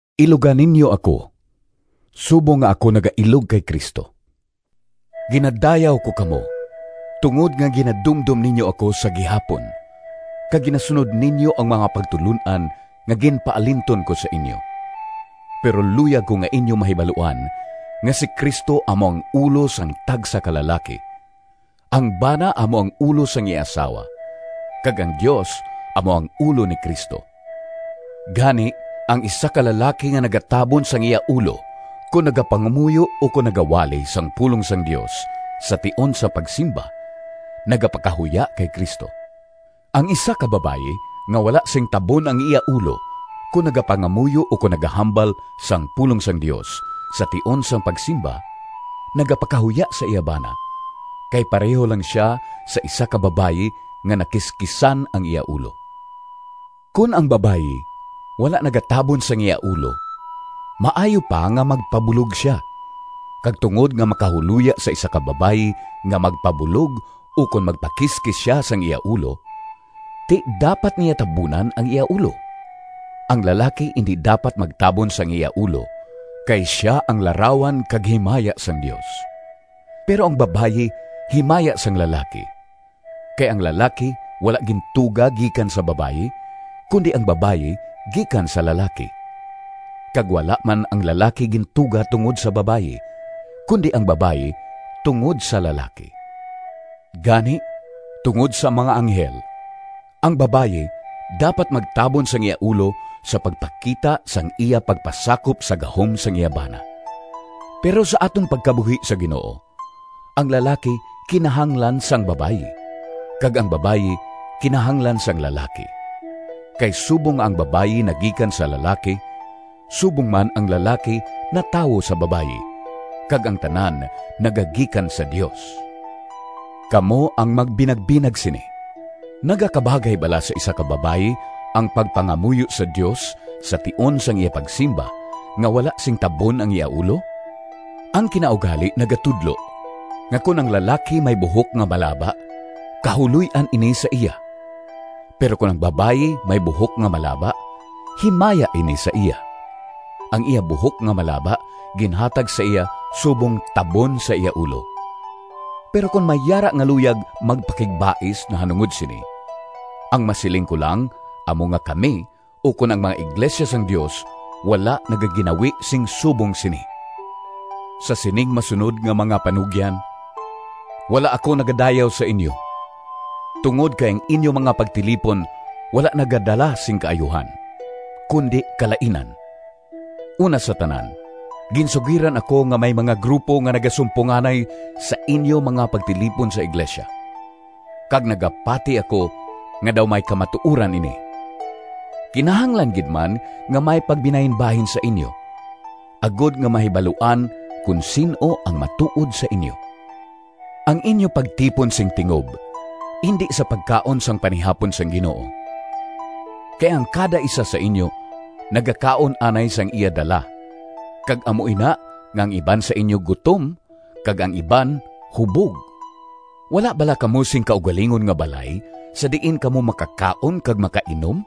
Iluga ninyo ako subong nga ako nagailog kay Cristo. Ginadayaw ko kamo tungod nga ginadumdom ninyo ako sa gihapon kag ginasunod ninyo ang mga pagtulon-an nga ginpaalinton ko sa inyo. Pero luyag ko nga inyo mahibaluan nga si Cristo amo ang ulo sang tagsa ka lalaki, ang bana amo ang ulo sang iya asawa, kag ang Dios amo ang ulo ni Cristo. Gani, ang isa ka lalaki nga nagatabon sang iya ulo kon nagapangamuyo ukon nagawali sang pulong sang Dios sa tion sang pagsimba, nagapakahuya kay Cristo. Ang isa ka babayi nga wala sing tabon ang iya ulo kon nagapangamuyo ukon nagahambal sang pulong sang Dios sa tion sang pagsimba, nagapakahuya sa iya bana, kay pareho lang sia sa isa ka babayi nga nakiskisan ang iya ulo. Kon ang babayi wala nagatabon sang iya ulo, maayo pa nga magpabulog sia. Kag tungod nga makahuloya sa isa ka babayi nga magpabulog ukon magpakiskis sia sang iya ulo, ti, dapat niya tabunan ang iya ulo. Ang lalaki indi dapat magtabon sang iya ulo, kay sia ang larawan kag himaya sang Dios. Pero ang babayi himaya sang lalaki. Kay ang lalaki wala gintuga gikan sa babayi, kundi ang babayi gikan sa lalaki. Kag wala man ang lalaki gintuga tungod sa babayi, kundi ang babayi tungod sa lalaki. Gani tungod sa mga anghel, ang babayi dapat magtabon sang iya ulo sa pagpakita sang iya pagpasakop sa gahom sang iya bana. Pero sa aton pagkabuhi sa Ginoo, ang lalaki kinahanglan sang babayi, kag ang babayi kinahanglan sang lalaki. Kay subong nga ang babayi nagikan sa lalaki, subong man ang lalaki natawo sa babayi, kag ang tanan nagagikan sa Dios. Kamo ang magbinagbinag sini: nagakabagay bala sa isa ka babayi ang pagpangamuyo sa Dios sa tion sang iya pagsimba nga wala sing tabon ang iya ulo? Ang kinaugali nagatudlo nga kon ang lalaki may buhok nga malaba kahuloy-an ini sa iya, pero kon ang babayi may buhok nga malaba, himaya ini sa iya. Ang iya buhok nga malaba ginhatag sa iya subong tabon sa iya ulo. Pero kon may yara nga luyag magpakigbais nahanungod sini, ang masiling ko lang amo nga kami ukon ang mga iglesia sang Dios wala nagaginawi sing subong sini. Sa sining masunod nga mga panugyan wala ako nagadayaw sa inyo, tungod kay ang inyo mga pagtilipon wala nagadala sing kaayuhan, kundi kalainan. Una sa tanan, ginsugiran ako nga may mga grupo nga nagasumponganay sa inyo mga pagtilipon sa iglesia, kag nagapati ako nga daw may kamatuoran ini. (Kinahanglan gid man nga may pagbinahinbahin sa inyo, agod nga mahibaluan kon sin-o ang matuod sa inyo.) Ang inyo pagtipon sing tingob indi sa pagkaon sang Panihapon sang Ginoo. Kay ang kada isa sa inyo nagakaon anay sang iya dala, kag amo ina nga ang iban sa inyo gutom kag ang iban hubog. Wala bala kamo sing kaugalingon nga balay sa diin kamo makakaon kag makainom?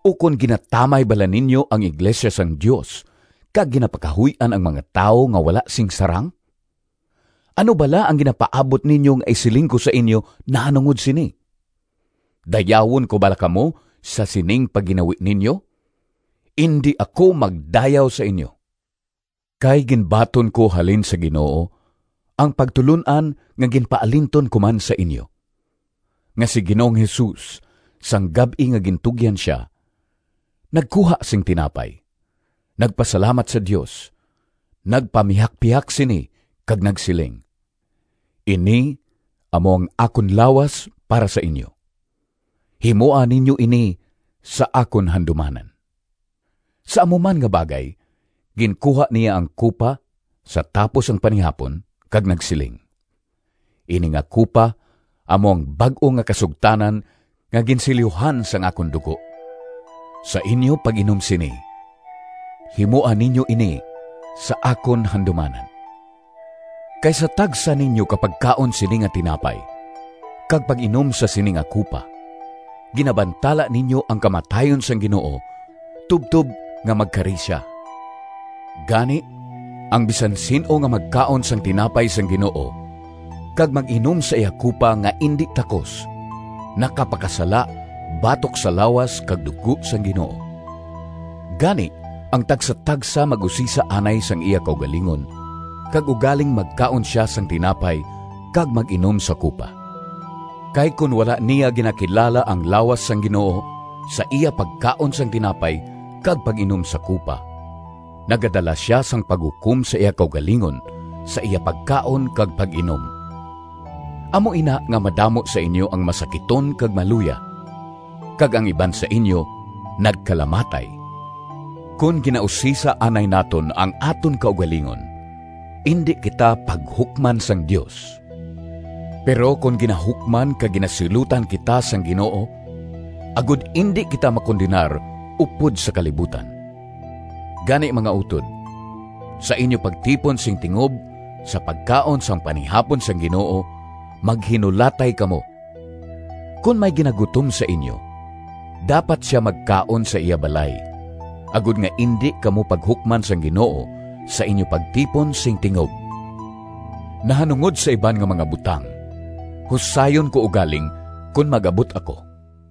Ukon ginatamay bala ninyo ang iglesia sang Dios kag ginapakahuy-an ang mga tawo nga wala sing sarang? Ano bala ang ginapaabot ninyo nga isiling ko sa inyo nahanungod sini? Dayawon ko bala kamo sa sining pagginawi ninyo? Indi ako magdayaw sa inyo! Kay ginbaton ko halin sa Ginoo ang pagtulon-an nga ginpaalinton ko man sa inyo: nga si Ginoong Jesus, sang gab-i nga gintugyan sia, nagkuha sing tinapay, nagpasalamat sa Dios, nagpamihakpihak sini kag nagsiling, “Ini amo ang akon lawas para sa inyo. Himoa ninyo ini sa akon handumanan.” Sa amo man nga bagay ginkuha niya ang kupa sa tapos ang panihapon kag nagsiling, “Ini nga kupa amo ang bag-o nga kasugtanan nga ginsilyuhan sang akon dugo. Sa inyo pag-inom sini, himoa ninyo ini sa akon handumanan.” Kay sa tagsa ninyo ka pagkaon sini nga tinapay kag pag-inom sa sini nga kupa, ginabantala ninyo ang kamatayon sang Ginoo tubtob nga magkari sia. Gani, ang bisan sin-o nga magkaon sang tinapay sang Ginoo kag mag-inom sa iya kupa nga indi takos, nakapakasala batok sa lawas kag dugo sang Ginoo. Gani, ang tagsatagsa mag-usisa anay sang iya kaugalingon kag ugaling magkaon sia sang tinapay kag mag-inom sa kupa. Kay kon wala niya ginakilala ang lawas sang Ginoo sa iya pagkaon sang tinapay kag pag-inom sa kupa, nagadala sia sang paghukom sa iya kaugalingon sa iya pagkaon kag pag-inom. Amo ina nga madamo sa inyo ang masakiton kag maluya, kag ang iban sa inyo nagkalamatay. Kon ginausisa anay naton ang aton kaugalingon, indi kita paghukman sang Dios. Pero ginahukman kag ginasilutan kita sang Ginoo, agod indi kita makondenar upod sa kalibutan. Gani, mga utod, sa inyo pagtipon sing tingob sa pagkaon sang panihapon sang Ginoo, maghinulatay kamo. Kon may ginagutom sa inyo, dapat sia magkaon sa iya balay, agod nga indi kamo paghukman sang Ginoo sa inyo pagtipon sing tingob. Nahanungod sa iban nga mga butang husayon ko ugaling kon mag-abot ako.